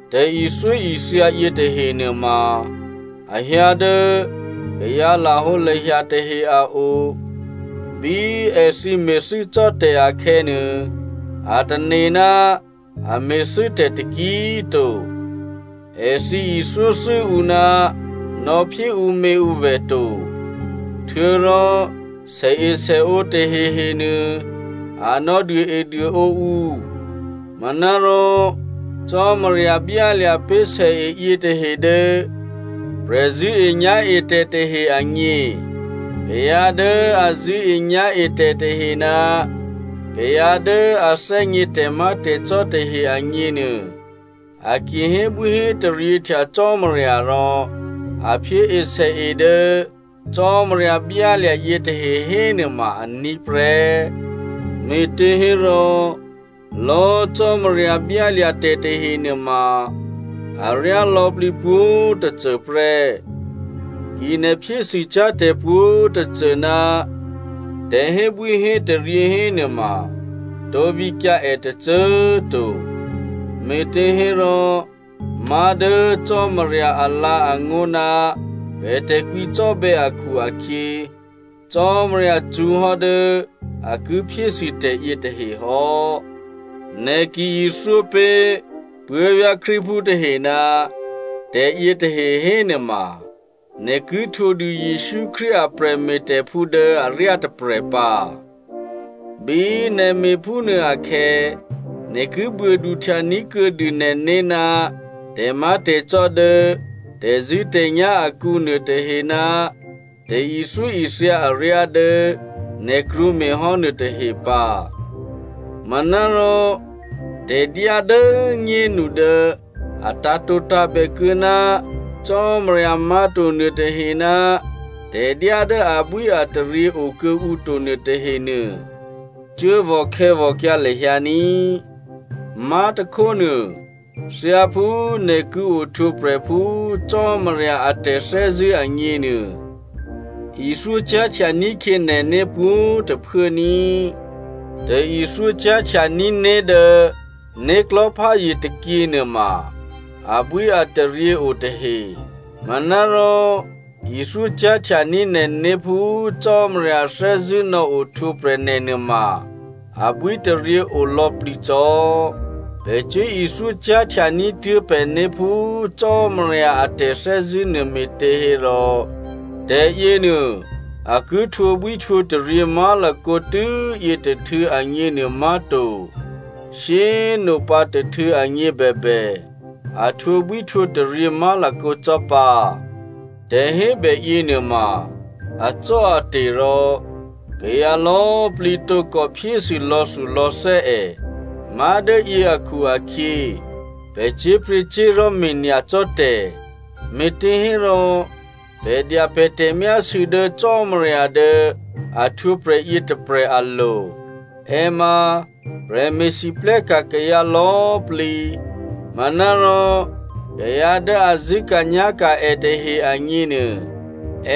Tè̤ithyóithya yětahe nuôma a hyǎ dố kayǎ lahǒlahya tahe a o. Bí èthǐ me̤thû́cò́tè̤ akhè̌nuô, a tane̤ ná a me̤thû́tè̤ taki꤮ to. Èthǐ ithyóthû́ ǔ ná nò̌phyé ǔměǔvè̤ to, htuô̌rò sèesèǒ tahehenuô a nò̌duôeduôǒ ǔ. Manárò Cò́marya byálya̤ pé̤ sèe yětahe dố prè̤zṳ̂́enyá̤etè̤ tahe agně. Kayǎ dố a zṳ̂́enyá̤etè̤ tahe ná kayǎ dố a thè́gně tè̤má̤tè̤cò́ tahe agněnuô, a ki hébwíhétaryěhtya Cò́marya rò a phyée sèe dố Cò́marya byálya̤ yětahe hénuôma aní̤ prè́. Me̤těhérò lò̌꤮ Cò́marya byálya̤ tè̤ tahe nuôma aryá lò̌plǐ pwǒ̤꤮ tôcô prè́. Ki nè̤ phyésûcyá̤ tè̤pwǒ̤꤮ tôcô ná tè̤hébwíhétaryě hénuôma tǒ vǐkyǎ è tôcô꤮ to. Me̤těhérò má̤ dố Cò́marya alǎ̤angó̤ ná pè̤ tè̤kwǐcò́bè̌ akhu-akhyě, Cò́marya cṳ̌hò́ dố a ki phyésû tè̤yětahe hò́. Nè̤ ki ithyópé̤ puố̤vyá̤ Krístuphú tahe ná tè̤yětahe hénuôma nè̤ ki htwǒdû Jesǔ Krístu a prè̤me̤tè̤phú dố aryá tôprè̤ pǎ. Bí nè̤ me̤phúnuô akhè̌, nè̤ ki buôduhtya ní̤ kuô̌dû nè̤né̤ ná tè̤má̤tè̤cò́ dố tè̤zṳ̂́tè̤nyá̤ akǔ nuôtahe ná tè̤ithyóithya aryá dố nè̤ krwǒ me̤hò́ nuôtahe pǎ. Manárò tè̤dyá dố꤮ nyénu dố a tǎ̤tǒtǎ̤bè kuô̌ ná cò́marya má̤to nuôtahe, tè̤dyá dố abwíataryě okuô̌ǔto nuôtahenuô, cuốvò̤ khè̌vò̤kyǎ lahyǎ ní꤮. Má̤tôkhónuô thyáphú nè̤ ki ohtwǒprè̤ phú Cò́marya a tè̤thè́zṳ̂́ agněnuô ithyó cyá̤htya ní̤khyě nè̤né̤ pwǒ̤꤮ tôphuố ní꤮. Tè̤ithyó cyá̤htya ní̤né̤ dố né̤klò̤́pházye tôkyě nuôma, abwíataryě o tahe. Manárò ithyó cyá̤htya ní̤ nè̤né̤ phú Cò́marya thè́zṳ̂́ nò̌ ohtwǒprè̤ nè̤ nuôma abwítaryě o lò̌plǐ cò́. Pè̤ cuốithyó cyá̤htya ní̤tuố̤ pè̤né̤ phú Cò́marya a tè̤thè́zṳ̂́ nuô me̤těhérò, tè̤yěnuô a ki htwǒbwíhtwǒtaryě má̤lakǒ tû́yě tôhtû̌ agněnuô má̤to, shyé꤮ nopǎ tôhtû̌ agně bèbè, a htwǒbwíhtwǒtaryě má̤lakǒ cò́ pǎ. Tè̤hébè yěnuôma acò́ate̤ rò kayǎ lò̌꤮ plǐ tǒkò phyésû lò̌thulò̌thè́ è, má̤dố yě akhu-akhyě, pè̤ cyé̤pryě̤cyé̤li̤ me̤nyacò́ tè̤, me̤těhérò pè̤ dya pè̤ tè̤myásû̌ dố Cò́marya dố a htwǒprè̤ yětôprè̤ alo̤. È ma prè̤me̤lwóhteka̤ kayǎ lò̌꤮ plǐ, manárò kayǎ dố a zṳ̂́ka̤nyá̤ka̤ è tahe agněnuô,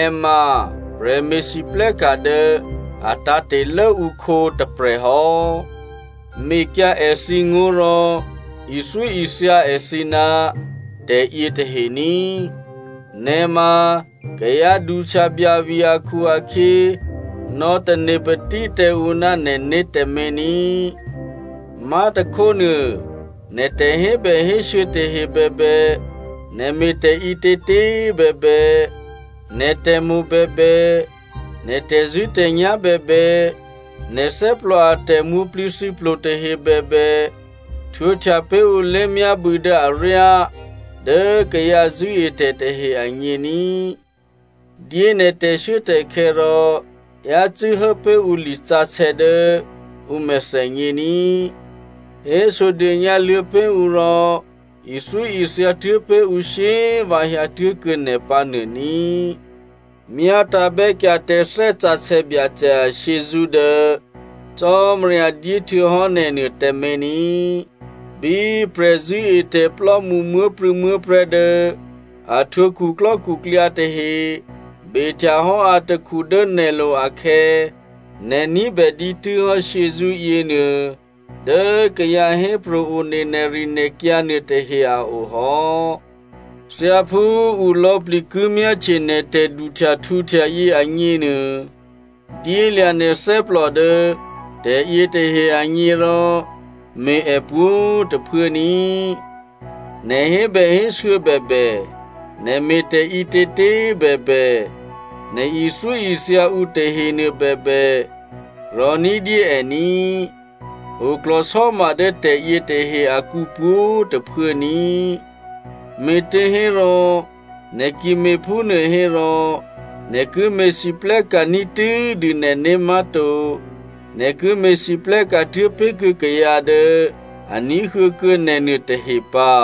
è ma prè̤me̤lwóhteka̤ dố a tǎ̤te̤ lốǔkhǒ tôprè̤hò́. Mekyǎ èthǐ ngó̤ rò ithyóithya èthǐ ná tè̤yě tahe ní꤮. Nè̤ ma kayǎ duhtyabyavi akhu-akhyě nò̌tane patí tǎ ǔ ná nè̤né̤ tǎmé̤ ní꤮. Má̤tôkhónuô, nè̤ tè̤hébèhésû̌ tahe bèbè, nè̤ me̤tè̤ ǐtětě꤮ bèbè, nè̤ tè̤mo̤ bèbè, nè̤ tè̤zṳ̂́tè̤nyá̤ bèbè, nè̤ thè́plò a tè̤mwǒ̤plǐthǐplo tahe bèbè, htwǒhtya pé̤ ǔ lé̤myábû̌ dố aryá dố kayǎ zṳ̂́etè̤ tahe agně ní꤮. Dyé nè̤ tè̤shuốtè̤khè̌ rò yácû́ hố pé̤ ǔ lisǎsè̌ dố ǔ mèthènyě ní꤮, hésodônyǎ luô̌ pé̤ ǔ rò, ithyóithya tuố̤ pé̤ ǔ shyé꤮ vǎ hyǎtuố̤kuô̌ nè̤ pǎnuô ní꤮. Myátǎ̤bè́kyǎ tǎ Thè́ Sǎsè̌ Byacè ashyězṳ́ dố Cò́marya dyéhtuô̌hò́ nè̤nuô tǎmé̤ ní꤮. Bí prè̤zṳ̂́etè̤plò́mṳ muố̤prû̌muố̤prè̤́ dố a htwǒ khuklò́khuklyǎ tahe behtya hò́ atakhu dố nè̤lo̤ akhè̌, nè̤ ní̤bè dǐtû́hò́ shyězṳ́ yěnuô dố kayǎ hépro̤ one nè̤rinè̤kyǎ nuôtahe a o hò́. Thyáphú ǔ lò̌plǐ ki myáhtye nè̤ tè̤duhtyahtǔhtya yě agněnuô, dyélya̤ nè̤ thè́plò dố tè̤yětahe agně rò me̤ è pwǒ̤꤮ tôphuố ní꤮. Nè̤ hébèhésû̌ bèbè, nè̤ me̤tè̤ ǐtětě꤮ bèbè, nè̤ ithyóithya ǔ tahenuô bèbè, rò̤ní̤dyé è ní꤮. Oklò̤sò́ma dố tè̤yětahe akǔ pwǒ̤꤮ tôphuố ní꤮, me̤těhérò, nè̤ ki me̤phúnuô hérò nè̤ ki me̤lwóhteka̤ ní̤tû́dû nè̤né̤ má̤to, nè̤ ki me̤lwóhteka̤ tuố̤ pé̤kuô̌ kayǎ dố a ní̤huô̌kuô̌ nè̤ nuôtahe pǎ.